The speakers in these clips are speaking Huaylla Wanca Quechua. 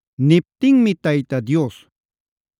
Niptinmi Tayta Dios: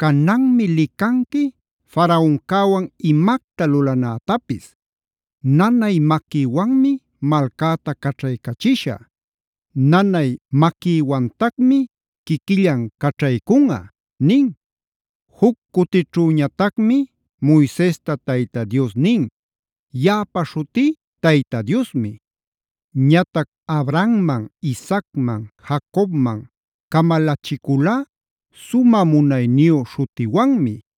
“Cananmi licanqui Faraoncäwan imacta lulanätapis. Nanay maquïwanmi malcäta caćhaycachishä. Nanay maquïwantacmi quiquillan caćhaycunꞌa” nin. Juc cutićhüñatacmi Moisesta Tayta Dios nin: “Yaꞌapa śhutí Tayta Diosmi. Ñatac Abrahamman, Isaacman, Jacobman camalachiculá sumä munayniyu śhutiwanmi.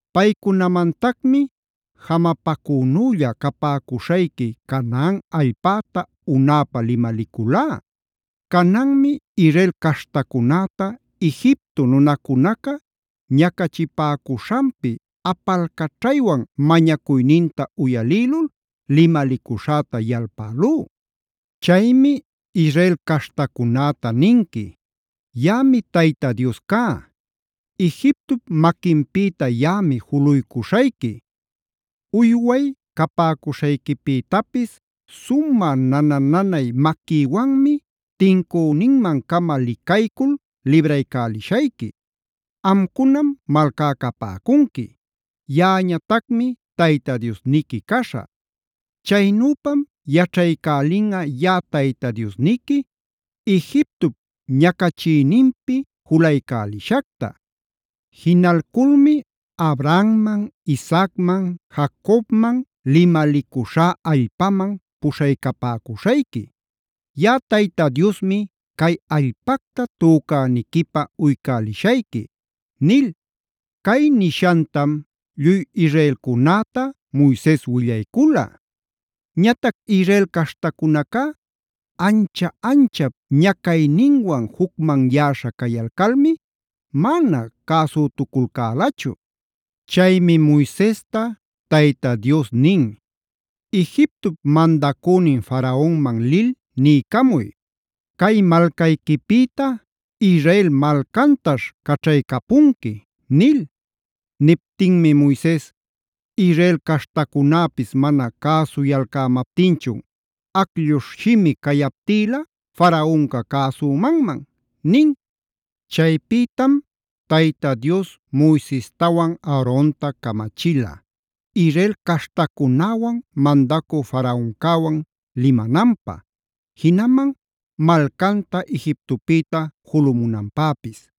Paycunamantacmi jamapacünülla capäcuśhayqui Canaan allpäta unäpä limaliculá. Cananmi Israel caśhtacunäta Egipto nunacunaca ñacachipäcuśhanpi apalcaćhaywan mañacuyninta uyalïlul limalicuśhäta yalpälú. “Chaymi Israel caśhtacunäta ninqui: Yaꞌami Tayta Dios cá. Egiptop maquinpïta yaꞌami juluycuśhayqui. Uyway capäcuśhayquipïtapis sumä nana-nanay maquïwanmi tincüninman-cama licaycul libraycälishayqui. Amcunam malcá capäcunqui; yaꞌañatacmi Tayta Diosniqui caśhä. Chaynüpam yaćhaycälinꞌa yaꞌa Tayta Diosniqui Egiptop ñacachiyninpi julaycälishacta. Jinalculmi Abrahamman, Isaacman, Jacobman limalicuśhá allpaman puśhaycapäcuśhayqui. Yaꞌa Tayta Diosmi cay allpacta tücäniquipä uycälishayqui” nil. Cay nishantam lluy Israelcunäta Moises willaycula. Ñatac Israel caśhtacunacá ancha-anchap ñacayninwan jucmanyäśha cayalcalmi mana cäsütuculcälachu. Chaymi Moisesta Tayta Dios nin: “Egiptop mandacünin Faraonman lil niycamuy: ‘Cay malcayquipïta Israel malcantaśh caćhaycapunqui’” nil. Niptinmi Moises: “Israel caśhtacunäpis mana cäsuyalcämaptinchun ¿aclluśh shimi cayaptïla Faraonca cäsümanman?” nin. Chaypïtam Tayta Dios Moisestawan Aaronta camachila, Israel caśhtacunäwan mandacü Faraoncäwan limananpä, jinaman malcanta Egiptopïta julumunanpäpis.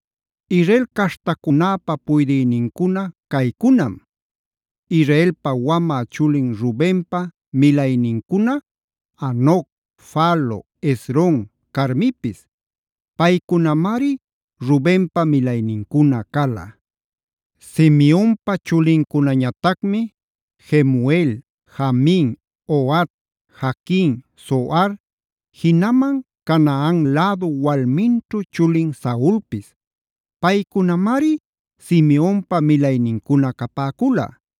Israel caśhtacunäpä puydïnincuna caycunam: Israelpa wamä chulin Rubenpa milaynincuna: Hanoc, Falu, Hezron, Carmipis. Paycunamari Rubenpa milaynincuna cala. Semionpa chulincunañatacmi: Jemuel, Jamin, Ohad, Jaquin, Zohar, jinaman Canaan lädu walminćhu chulin Saulpis. Paycunamari Simeonpa milaynincuna capäcula.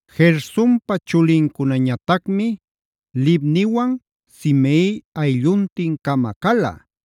Gersonpa chulincunañatacmi: Libniwan, Simei aylluntin-cama cala.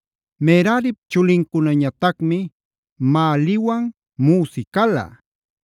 Merarip chulincunañatacmi: Mahliwan Musi cala.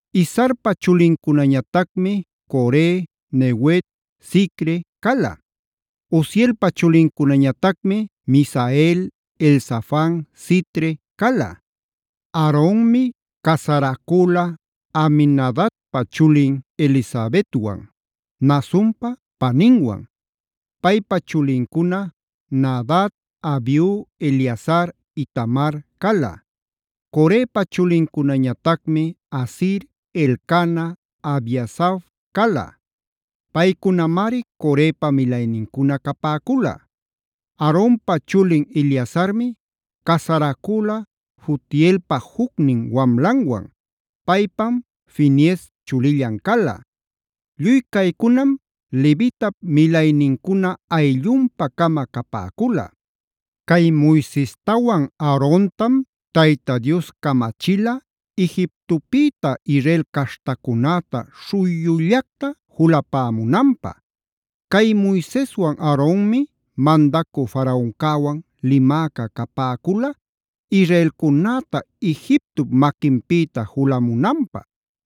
Izharpa chulincunañatacmi: Core, Nefeg, Zicri cala. Uzielpa chulincunañatacmi: Misael, Elzafan, Sitri cala. Aaronmi casaracüla Aminadabpa chulin Elisabetwan; Naasonpa paninwan. Paypa chulincuna: Nadab, Abiu, Eleazar, Itamar cala. Corepa chulincunañatacmi: Asir, Elcana, Abiasaf cala. Paycunamari Corepa milaynincuna capäcula. Aaronpa chulin Eleazarmi casaracüla Futielpa jucnin wanlanwan. Paypam Finees chulillan cala. Lluy caycunam levitap milaynincuna ayllunpa-cama capäcula. Cay Moisestawan Aarontam Tayta Dios camachila Egiptopïta Israel caśhtacunäta śhuyullactac julapämunanpä. Cay Moiseswan Aaronmi mandacü Faraoncäwan limäca capäcula israelcunäta Egiptop maquinpïta julamunanpä.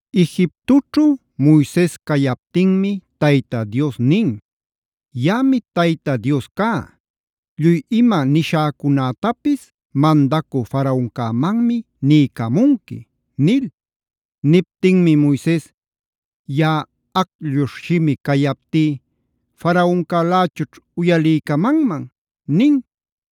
Egiptoćhu Moises cayaptinmi Tayta Dios nin: “Yaꞌami Tayta Dios cá. Lluy ima nishäcunätapis mandacü Faraoncämanmi niycamunqui” nil. Niptinmi Moises: “Yaꞌa aclluśh shimi cayaptí ¿Faraoncälächućh uyaliycamanman?” nin.